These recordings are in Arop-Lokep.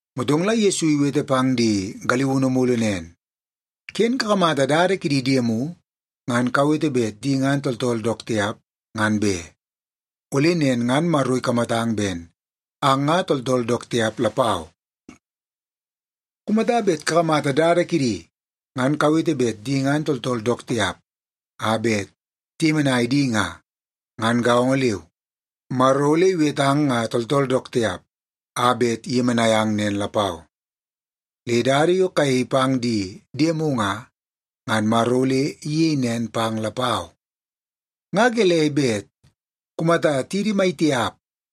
Motong la Yesu iwete pang di galiunu mulu nen, “Ken kakamata dada kidi diemu ngan kawete bet di ngan tooltool dook tiap, ngan be. Ole nen ngan Maro ikamatang ben ang nga tooltool dook tiap lapau. Kumata bet kakamata dada kidi ngan kawete bet di ngan tooltool dook tiap a bet tiyemenai di nga, ngan gaongo leu, Maro ole iwetang nga tooltool dook tiap a bet iyemenai ang nen lapau. Le dada yo kayei pang di diemu nga, ngan Maro ole iyei nen pang lapau. “Nga gelei bet kumata tidi maitiap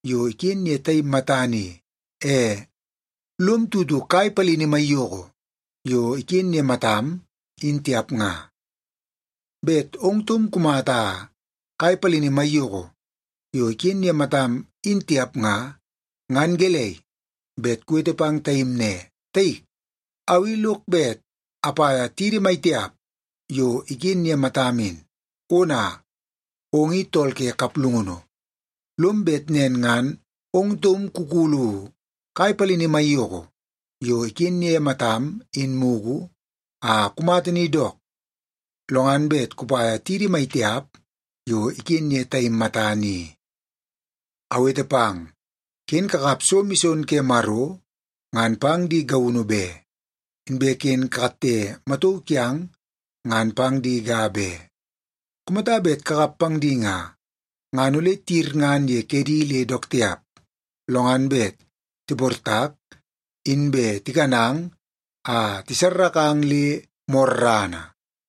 yo iken ye taim matana i, e lom tutu kai palini maiyoko yo iken ye matam, in tiap nga? Bet ong taum kumata kai palini maiyoko yo iken ye matam, in tiap nga, ngan gelei bet kuwete pang taim ne, ‘Taik, au i lok bet apaia tidi maitiap yo iken ye matam in.’ Ona, ong in tool ke kaplungunu! Lom bet nen ngan ong taum kukulu kai palini maiyoko yo iken ye matam in mugu a kumata ni dook, lo ngan bet kupaia tidi maitiap yo iken ye taim matana i. “Awete pang, ken kakap so mison ke Maro ngan pang di gaunu be, inbe ken kakatte matauu kiang ngan pang di ga be. Kumata bet kakap pang di nga, ngan ole tiyirngan ye kedi le dook tiap, lo ngan bet tiportak inbe tikanang a tisarrakang le morrana.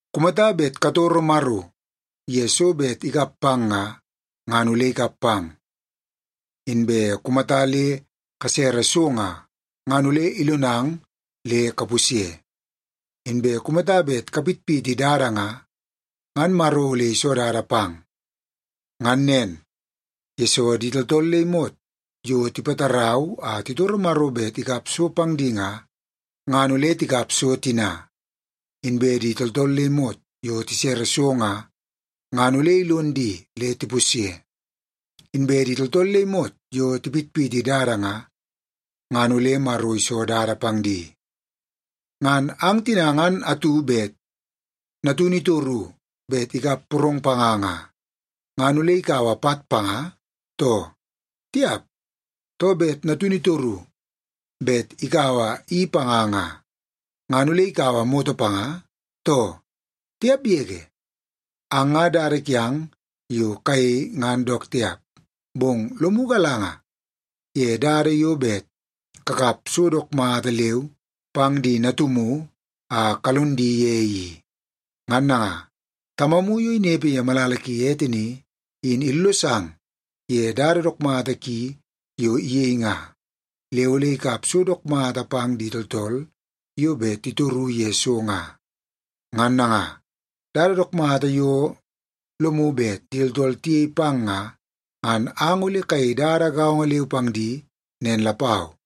“Kumata bet katoro Maro ye so bet ikap pang nga, ngan ole ikap pang. Inbe kumata le kasere so nga, ngan ole ilonang le kapusye. Inbe kumata bet kapitpiti dada nga, ngan Maro ole iso dada pang. Ngan nen, yesoo di tooltool le imot yo tipatarau a titoro Maro bet ikap so pang di nga, ngan ole tikap so tina. Inbe di tooltool le imot yo tisere so nga, ngan ole ilon di le tipusye. Inbe di tooltool le imot yo tipitpiti dada nga, ngan ole Maro iso dada pang di. “Ngan ang tina ngan atu bet natunu itoru bet ikap porong panga nga, ngan ole ikaua pat panga, too? Tiap! Too, bet natunu itoru bet ikaua i panga nga, ngan ole ikaua moto panga, too? Tiap yege! Ang nga dada kiang yo kayei ngan dook tiap, bong lomu galanga ye dada yo bet kakap so dook mata leu pang di natumu a kalon di ye i. Ngan nanga, Tamamu yo inepe ye malala ki ete ni, in illosang ye dada dook mata ki yo iyei nga, le ole ikap so dook mata pang di tooltool yo bet titoru ye so nga. Ngan nanga, dada dook mata yo lomu bet di tooltool tiyei pang nga, ngan ang ole kayei dada gaongo leu pang di nen lapau.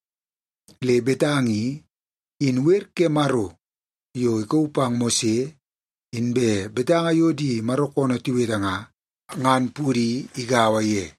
Le betanga i, in wer ke Maro yo ikauu pang Mose, inbe betanga yo di Maro koonoo tiwete nga, ngan pudi igaua ye.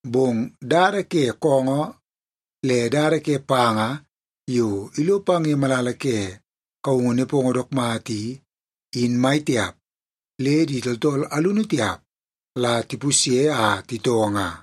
Bong dada ke koongoo le dada ke panga yo ilo pang ye malala ke kaungu nepongo dook mata i, in mai tiap le di tooltool alunu tiap la tipusye a titoo nga.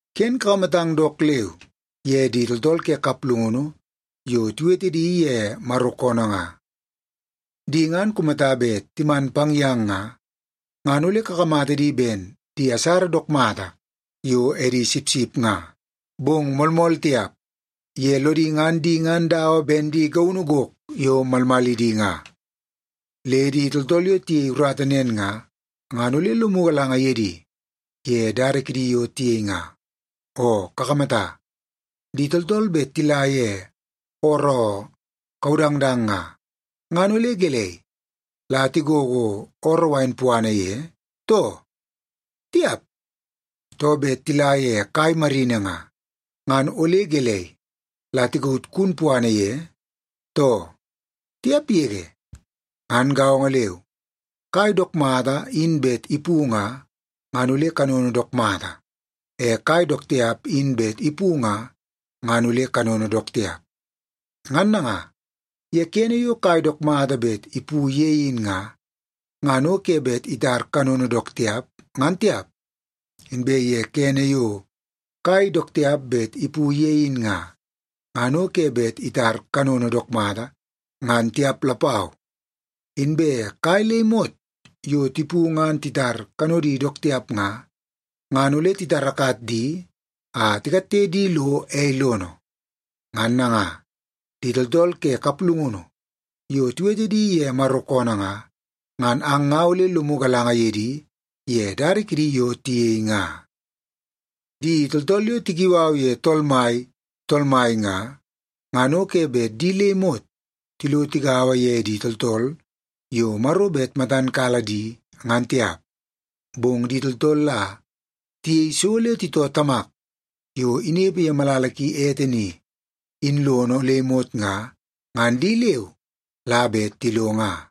“Ken kakamatang dook leu ye di tooltool ke kaplungunu yo tiwete di ye Maro koonoo nga. Di ngan kumata bet timan pang yang nga, ngan ole kakamata di ben di asara dook mata yo edi sipsip nga, bong moolmool tiap, ye lodi ngan di ngan dawa ben di gaunu gok yo malmalidi nga. Le di tooltool yo tiyei urata nen nga, ngan ole lomu galanga ye di ye dada kidi yo tiyei nga. Oo kakamata, di tooltool bet tila ye ooroo kaudangdang nga, ngan ole gelei, la tigogo ooroo wain puana ye, too? Tiap! Too, bet tila ye kai marini nga, ngan ole gelei, la tikaut kun puana ye, too? Tiap yege! Ngan gaongo leu, kai dook mata in bet ipu nga, ngan ole kanono dook mata. E kai dook tiap in bet ipu nga, ngan ole kanono dook tiap. Ngan nanga, ye kene yo kai dook mata bet ipu ye in nga, ngan o ke bet itar kanono dook tiap, ngan tiap. Inbe kene yo kai dook tiap bet ipu ye in nga, ngan o ke bet itar kanono dook mata, ngan tiap lapau. Inbe kai le imot yo tipu ngan titar kanodi dook tiap nga, ngan ole titarakat di a tikatte di lo ei lono. Ngan nanga, di tooltool ke kaplungunu yo tiwete di ye Maro koonoo nga, ngan ang nga ole lomu galanga ye di ye dada kidi yo tiyei nga.” “Di tooltool yo tikiu au ye ‘Tool Mai, Tool Mai’ nga, ngan o ke bet di le imot tilo tigaua ye di tooltool yo Maro bet matan kala di, ngan tiap. Bong di tooltool la tiyei so le titoo Tamak yo inepe ye malala ki ete ni, in lono le imot nga, ngan di leu la bet tilo nga.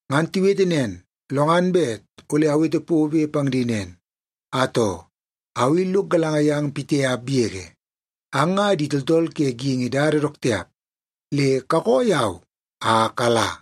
Ngan tiwete nen, lo ngan bet ole awete pobe pang di nen, ‘Atoo, au i lok galanga yang pitiap yege. Ang nga di tooltool ke geingi dada dook tiap, le kakoo yau a kala!’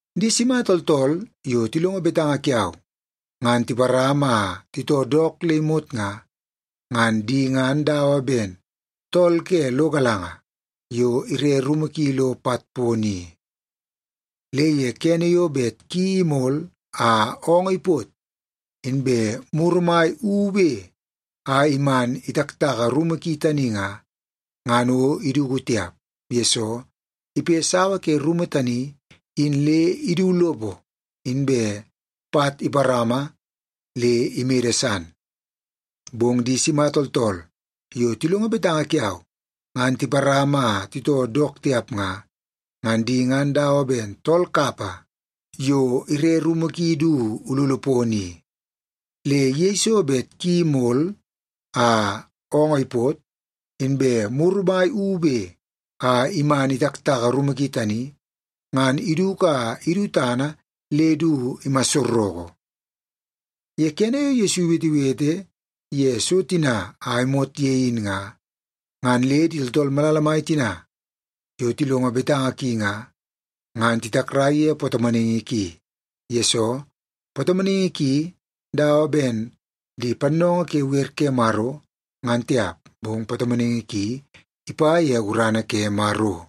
“Di sima tooltool yo tilongo betanga kiau, ngan tiparama a titoo dook le imot nga, ngan di ngan dawa ben tool ke lo galanga yo ire rumu ki lo pat pono i. Le ye kene yo bet ki imol a oongoo ipot, inbe muru mai ube a iman itaktaka rumu ki tani nga, ngan o iduku tiap. Yesoo, ipe sawa ke rumu tani in le idu lopo inbe pat iparama le imede san. Bong di sima tooltool yo tilongo betanga kiau, ngan tiparama a titoo dook tiap nga, ngan di ngan dawa ben tool kapa yo ire rumu ki du ululu pono i. Le yeiso bet ki mol a oongoo ipot, inbe muru mai ube a iman itaktaka rumu ki tani, ngan iduku a idu tana le du imassoroko.” Ye kene yo Yesu iwetewete ye so tina a imot ye in nga, ngan le di tooltool malala mai tina yo tilongo betanga ki nga, ngan titakrai ye patomonaingi ki, yesoo patomonaingi ki dawa ben di pannoongoo ke wer ke Maro, ngan tiap, bong patomonaingi ki ipa ye gurana ke Maro.